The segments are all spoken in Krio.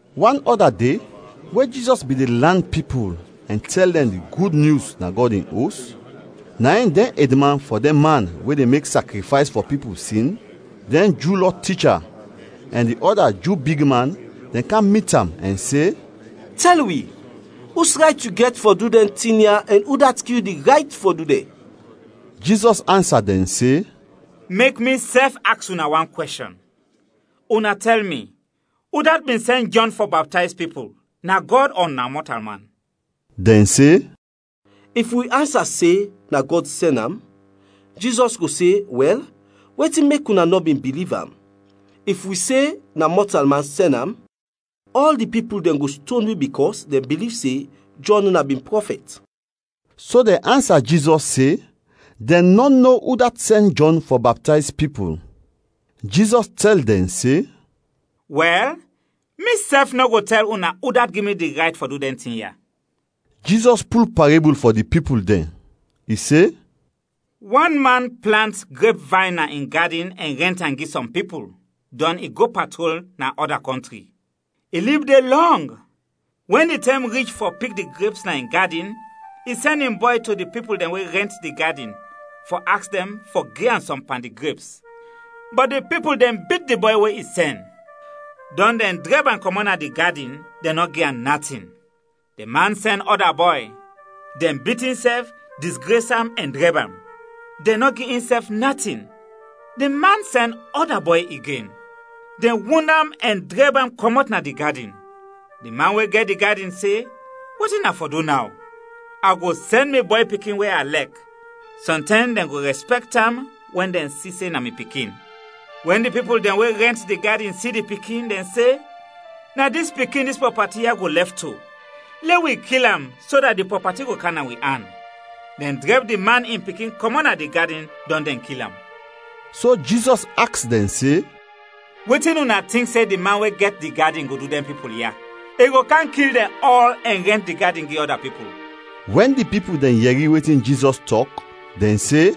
Wan ɔda de, we Jizɔs bin de lan pipul ɛn tɛl dɛn di Gud Nyus na Gɔd in Os, na in dɛn edman fɔ dɛn man we de mek sakrifays fɔ pipul sin, dɛn Ju Lɔ ticha, ɛn di ɔda Ju bigman dɛn kam mit am ɛn se, “Tɛl wi, us rayt yu gɛt fɔ du dɛn tin ya ɛn udat gi yu di rayt fɔ du dɛn?” Jizɔs ansa dɛn se, “Mek misɛf aks una wan kwɛshɔn; una tɛl mi, udat bin sɛn Jɔn fɔ baptayz pipul, na Gɔd ɔ na mɔtalman?” Dɛn se, “If wi ansa se, ‘Na Gɔd sɛn am,’ Jizɔs go se, ‘Wɛl, wetin mek una nɔ bin biliv am?’ If wi se, ‘Na mɔtalman sɛn am’ ɔl di pipul dɛn go ston wi bikɔs dɛn biliv se Jɔn na bin prɔfɛt.” So dɛn ansa Jizɔs se dɛn nɔ no udat sɛn Jɔn fɔ baptayz pipul. Jizɔs tɛl dɛn se, “Wɛl, misɛf nɔ go tɛl una udat gi mi di rayt fɔ du dɛn tin ya.” Jizɔs pul parebul fɔ di pipul dɛn, i se: “Wan man plant grepvayn na in gadin ɛn rɛnt am gi sɔm pipul, dɔn i go patrol na ɔda kɔntri. I lib de lɔng. Wɛn di tɛm rich fɔ pik di greps na in gadin, i sɛn in bɔy to di pipul dɛn we rɛnt di gadin fɔ aks dɛn fɔ gi am sɔm pan di greps, bɔt di pipul dɛn bit di bɔy we i sɛn, dɔn dɛn drɛb am kɔmɔt na di gadin, dɛn nɔ gi am natin. Di man sɛn ɔda bɔy; dɛn bit insɛf, disgres am, ɛn drɛb am. Dɛn nɔ gi insɛf natin. Di man sɛn ɔda bɔy igen, dɛn wund am ɛn drɛb am kɔmɔt na di gadin. Di man we gɛt di gadin se, ‘Wetin a fɔ du naw? A go sɛn mi bɔy pikin we a lɛk, sɔntɛm dɛn go rɛspɛkt am wɛn dɛn si se na mi pikin.’ Wɛn di pipul dɛn we rɛnt di gadin si di pikin, dɛn se, ‘Na dis pikin dis prɔpati ya go lɛf to. Lɛ wi kil am so dat di prɔpati go kam na wi an.’ Dɛn drɛb di man in pikin kɔmɔt na di gadin dɔn dɛn kil am.” So Jizɔs aks dɛn se, “Wetin una tink se di man we gɛt di gadin go du dɛn pipul ya? I go kam kil dɛn ɔl ɛn rɛnt di gadin gi ɔda pipul.” Wɛn di pipul dɛn yɛri wetin Jizɔs tɔk, dɛn se,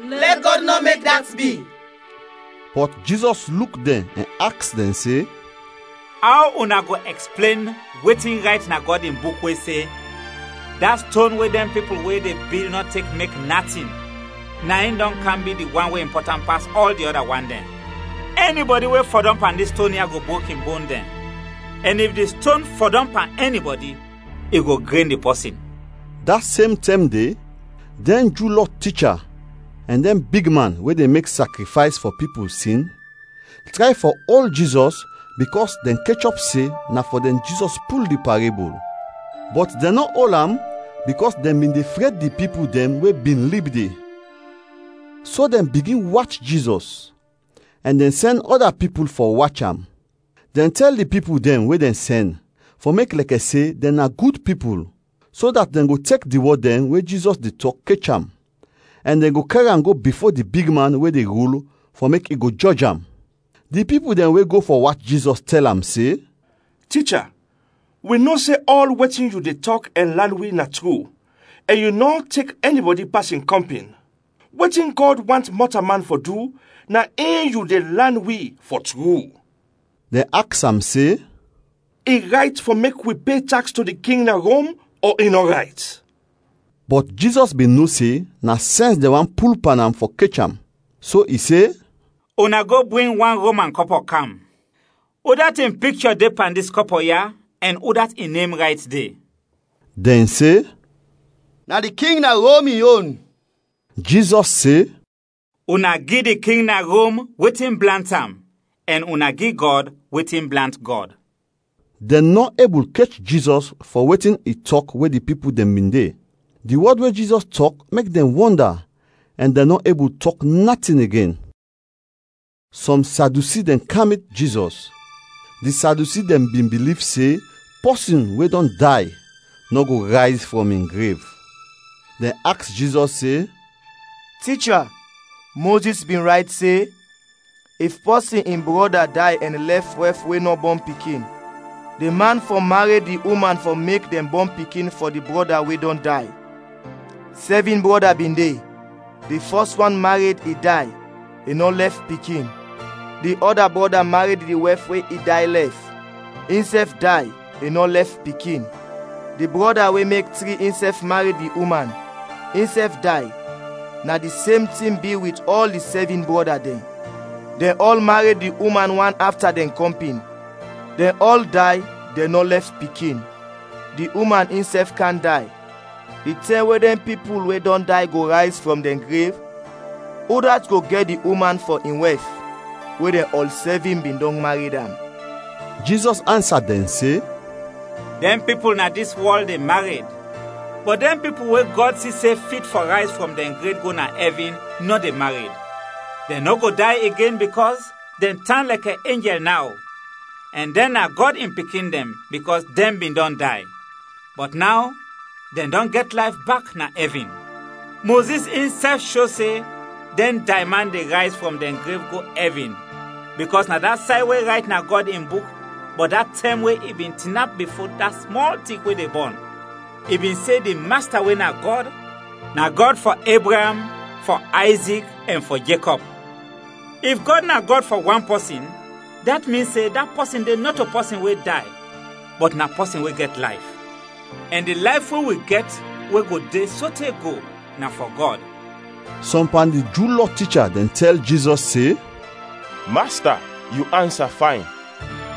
“Lɛ Gɔd nɔ mek dat bi!” Bɔt Jizɔs luk dɛn ɛn aks dɛn se, “Aw una go ɛksplen wetin rayt na Gɔd in Buk we se, ‘Da ston we dɛn pipul we de bil nɔ tek mek natin, na in dɔn kam bi di wan we impɔtant pas ɔl di ɔda wan dɛn.’ Ɛnibɔdi we fɔdɔm pan dis ston ya go brok in bon dɛn ɛn if di ston fɔdɔm pan ɛnibɔdi, i go gren di pɔsin.” Da sem tɛm de, dɛn Ju Lɔ ticha ɛn dɛn bigman we de mek sakrifays fɔ pipul sin tray fɔ ol Jizɔs bikɔs dɛn kechɔp se na fɔ dɛn Jizɔs pul di parebul, bɔt dɛn nɔ ol am bikɔs dɛn bin de fred di pipul dɛn we bin lib de. So dɛn bigin wach Jizɔs, ɛn dɛn sɛn ɔda pipul fɔ wach am. Dɛn tɛl di pipul dɛn we dɛn sɛn, fɔ mek lɛkɛ se dɛn na gud pipul, so dat dɛn go tek di wɔd dɛn we Jizɔs de tɔk kech am ɛn dɛn go kɛr am go bifo di bigman we de rul fɔ mek i go jɔj am. Di pipul dɛn we go fɔ wach Jizɔs tɛl am se, “Ticha, wi no se ɔl wetin yu de tɔk ɛn lan wi na tru ɛn yu nɔ tek ɛnibɔdi pas in kɔmpin. Wetin Gɔd want mɔtalman fɔ du, na in yu de lan wi, fɔ tru.” Dɛn aks am se, “I rayt fɔ mek wi pe taks to di king na Rom ɔ i nɔ rayt?” Bɔt Jizɔs bin no se na sɛns dɛn want pul pan am fɔ kech am, so i se, “Una go bring wan Roman kɔpɔ kam. Udat in pikchɔ de pan dis kɔpɔ ya ɛn udat in nem rayt de?” Dɛn se, “Na di king na Rom in yon.” Jizɔs se, “Una gi di king na Rom wetin blant am ɛn una gi Gɔd wetin blant Gɔd.” Dɛn nɔ ebul kech Jizɔs fɔ wetin i tɔk we di pipul dɛn bin de; di wɔd we Jizɔs tɔk mek dɛn wɔnda ɛn dɛn nɔ ebul tɔk natin igen. Sɔm Sadyusi dɛn kam mit Jizɔs; di Sadyusi dɛn bin biliv se pɔsin we dɔn day nɔ go rayz frɔm in grev. Dɛn aks Jizɔs se, “Ticha, Mozis bin rayt se, ‘If pɔsin in brɔda day ɛn lɛf wɛf we nɔ bɔn pikin, di man fɔ mared di uman fɔ mek dɛn bɔn pikin fɔ di brɔda we dɔn day.’ Sɛvin brɔda bin de, di fɔs wan mared, i day, i nɔ lɛf pikin. Di ɔda brɔda mared di wɛf we i day lɛf, insɛf day, i nɔ lɛf pikin. Di brɔda we mek tri insɛf mared di uman, insɛf day, na di sem tin bi wit ɔl di sɛvin brɔda dɛn. Dɛn ɔl mared di uman wan afta dɛn kɔmpin, dɛn ɔl day, dɛn nɔ lɛf pikin. Di uman insɛf kam day. Di tɛm we dɛn pipul we dɔn day go rayz frɔm dɛn grev, udat go gɛt di uman fɔ in wɛf we dɛn ɔl sɛvin bin dɔn mared am?” Jizɔs ansa dɛn se, “Dɛn pipul na dis wɔl de mared; bɔt dɛn pipul we Gɔd si se fit fɔ rayz frɔm dɛn grev go na ɛvin, nɔ de mared. Dɛn nɔ go day igen bikɔs dɛn tan lɛkɛ enjɛl naw ɛn dɛn na Gɔd in pikin dɛn bikɔs dɛn bin dɔn day, bɔt naw dɛn dɔn gɛt layf bak na ɛvin. Mozis insɛf sho se dɛn dayman de rayz frɔm dɛn grev go ɛvin bikɔs na da say we rayt na Gɔd in Buk bɔt da tɛm we i bin tinap bifo da smɔl tik we de bɔn, i bin se di Masta we na Gɔd, na Gɔd fɔ Ebraam, fɔ Ayzik, ɛn fɔ Jekɔb. If Gɔd na Gɔd fɔ wan pɔsin, dat min se da pɔsin de nɔto pɔsin we day bɔt na pɔsin we gɛt layf, ɛn di layf we wi gɛt we go de sote go na fɔ Gɔd.” Sɔm pan di Ju Lɔ ticha dɛn tɛl Jizɔs se, “Masta, yu ansa fayn.”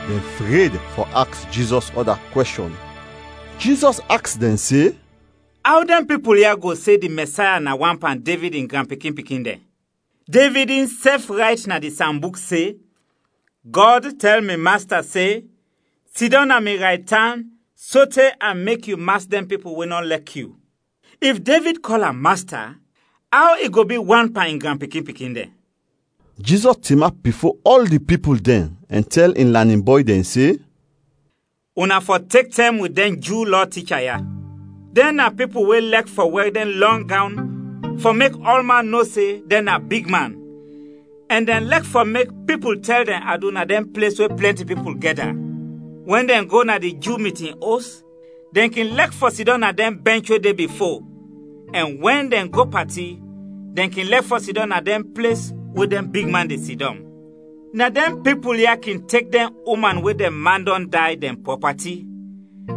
Dɛn fred fɔ aks Jizɔs ɔda kwɛshɔn. Jizɔs aks dɛn se, “Aw dɛn pipul ya go se di Mɛsaya na wan pan Devid in granpikin-pikin dɛn? Devid insɛf rayt na di Sambuk se, ‘Gɔd tɛl mi Masta se: Sidɔm na mi raytan sote a mek yu mas dɛn pipul we nɔ lɛk yu.’ If Devid kɔl am Masta, aw i go bi wan pan in granpikin-pikin dɛn?” Jizɔs tinap bifo ɔl di pipul dɛn ɛn tɛl in lanin bɔy dɛn se, “Una fɔ tek tɛm wit dɛn Ju Lɔ ticha ya. Dɛn na pipul we lɛk fɔ wɛr dɛn lɔng gawn fɔ mek ɔlman no se dɛn na big man ɛn dɛn lɛk fɔ mek pipul tɛl dɛn adu na dɛn ples we plɛnti pipul gɛda. Wɛn dɛn go na di Ju mitin os, dɛn kin lɛk fɔ sidɔm na dɛn bɛnch we de bifo ɛn wɛn dɛn go pati, dɛn kin lɛk fɔ sidɔm na dɛn ples we dɛn bigman de sidɔm. Na dɛn pipul ya kin tek dɛn uman, we dɛn man dɔn day, dɛn prɔpati,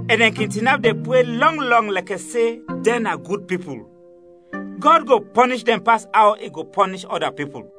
ɛn dɛn kin tinap de pre lɔng lɔng lɛkɛ se dɛn na gud pipul. Gɔd go pɔnish dɛn pas aw i go pɔnish ɔda pipul.”